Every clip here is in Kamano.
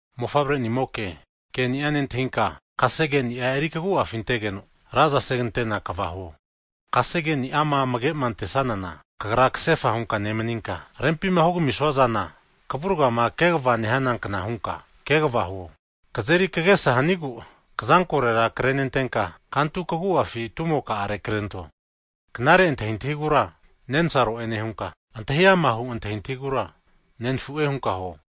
Mofavre'nimoke, Keni'a nentahinka, kasegeni'a eri kagu'afi antegeno raza segantena kva huo. Kasegeni'ama amage antesanana kagra kasefa hunka nemaninka, rempima hugamisua zana kavurgama kegava nehanankna hunka kegava huo. Kazeri kagesa hanigu rini kazampi antaniankna hunka kantu kagu'afi tumoka'are krento. Knare antahintahigura nensaro'e nehunka, antahi amahu antahintahigura nenafu'e hunka huo.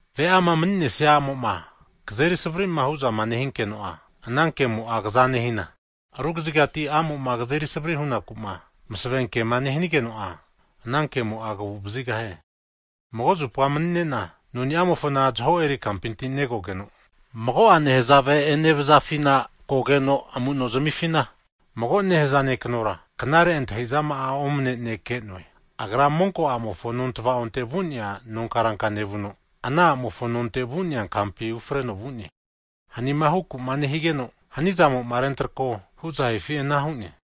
Ve'ama mani'nesia a'mo'ma kazeri savri'ma hu'zama nehinkeno'a, ana kemo'a kaza nehina rugazigati a'mo'ma kazeri savri hunaku'ma masavenkema nehanigeno'a, anankemo'a kagu'vazigahie. Mago zupa mani'ne'na noniamofona zaho eri kampinti negogeno, mago'a nehazave enevazafina kogeno amuno zamifina, mago nehaza ne'kanora, knare antahi'zama'a omane'nea ne' ke'noe. Agra monko'amofo nontava'onte vu'nea nonkaranka nevuno, ana a'mofo nonte vu'nea kampi ufreno vu'ne. Hanima huku'ma nehigeno hanimo'ma rentrako huzahifi anara hu'ne.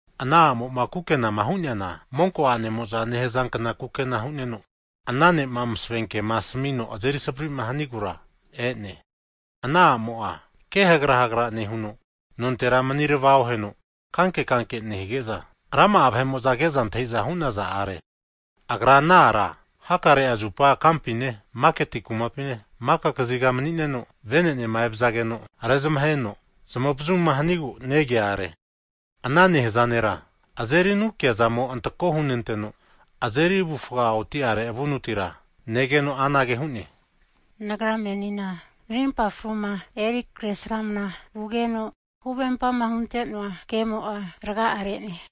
Ana a'mo'ma kukenama hu'neana monko a'nemo'za nehazankna kukena hu'neno, ana ne'ma masavenkema asamino azeri savri'ma hanigura e'ne. Ana a'mo'a kehagra hagra nehuno, nontera manirava oheno kankekanke nehige'za, rama vahe'mo'za ke'za antahi'za hu'naza are. Ana a'mo'a hakarea zupa kampine, maketi kumapine, maka kaziga mani'neno vene'nema evazageno'a rezamaheno zamavazuma hanigu negea akino, ana nehaza nera azeri anukiazamo antako hunenteno, avufga azeri oti'are avunutira negeno anage hu'ne, Nagra menina narimpa fruma eri kresramana vugeno, huvempama hunte'noa kemo'a raga re'ne.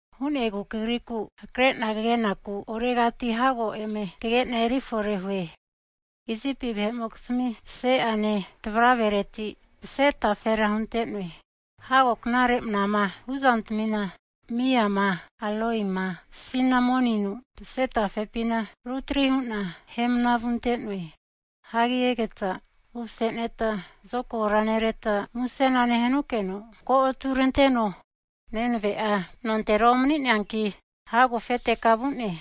Hu'negu kagriku hakare'na kagenaku oregati hago eme kage'na eri forehue. Isipi vahe'mokizmi pse'ane tavravereti mase tafera hunte'noe. Hago knare manama vuzantamina miama, aloima, sinamoninu mase tafepina rutri hu'na ahemna vunte'noe. Hagi egeta umaseneta, zokagora nereta musena nehanukeno ko'aturanteno. Nenave'a nontera omani'neanki, hago afete ka vu'ne.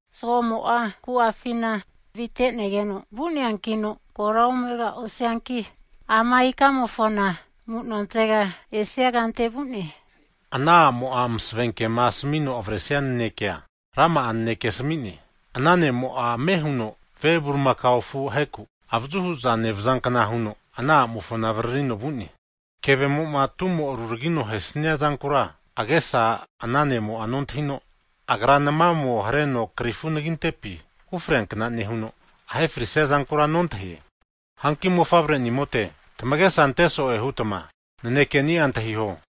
Zgomo'a ku'afina avite'negeno vu'neankino kora omegosianki ama ikamofona amu'nontega esia kante vu'ne. Ana a'mo'a masavenkema asamino avresia nanekea, rama'a naneke asami'ne. Ana ne'mo'a ame huno ve bulimakao afu aheku avazu hu'za nevazankna huno ana a'mofona avaririno vu'ne. Kevemo'ma tumo'ruragino ahesnia zankura agesa ana ne'mo'a nontahino, agra namamo hareno krifu anagintepi ufreankna nehuno, ahe frisia zankura nontahie. Hanki mofavre'nimote, tamagesa anteso'e hutma nanekeni'a antahiho,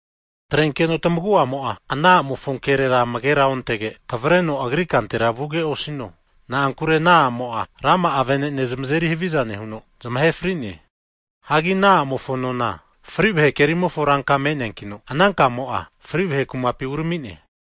Atrenkeno tamagu'amo'a ana a'mofo kerera amagera ontege, kavareno agri kantera ovino. Na'ankure ana a'mo'a rama'a vene'ne zamazeri haviza nehuno, zamahe fri'ne. Hagi ana a'mofo nona fri vahe kerimofo ranka me'neankino, ana kamo'a fri vahe kumapi urami'ne.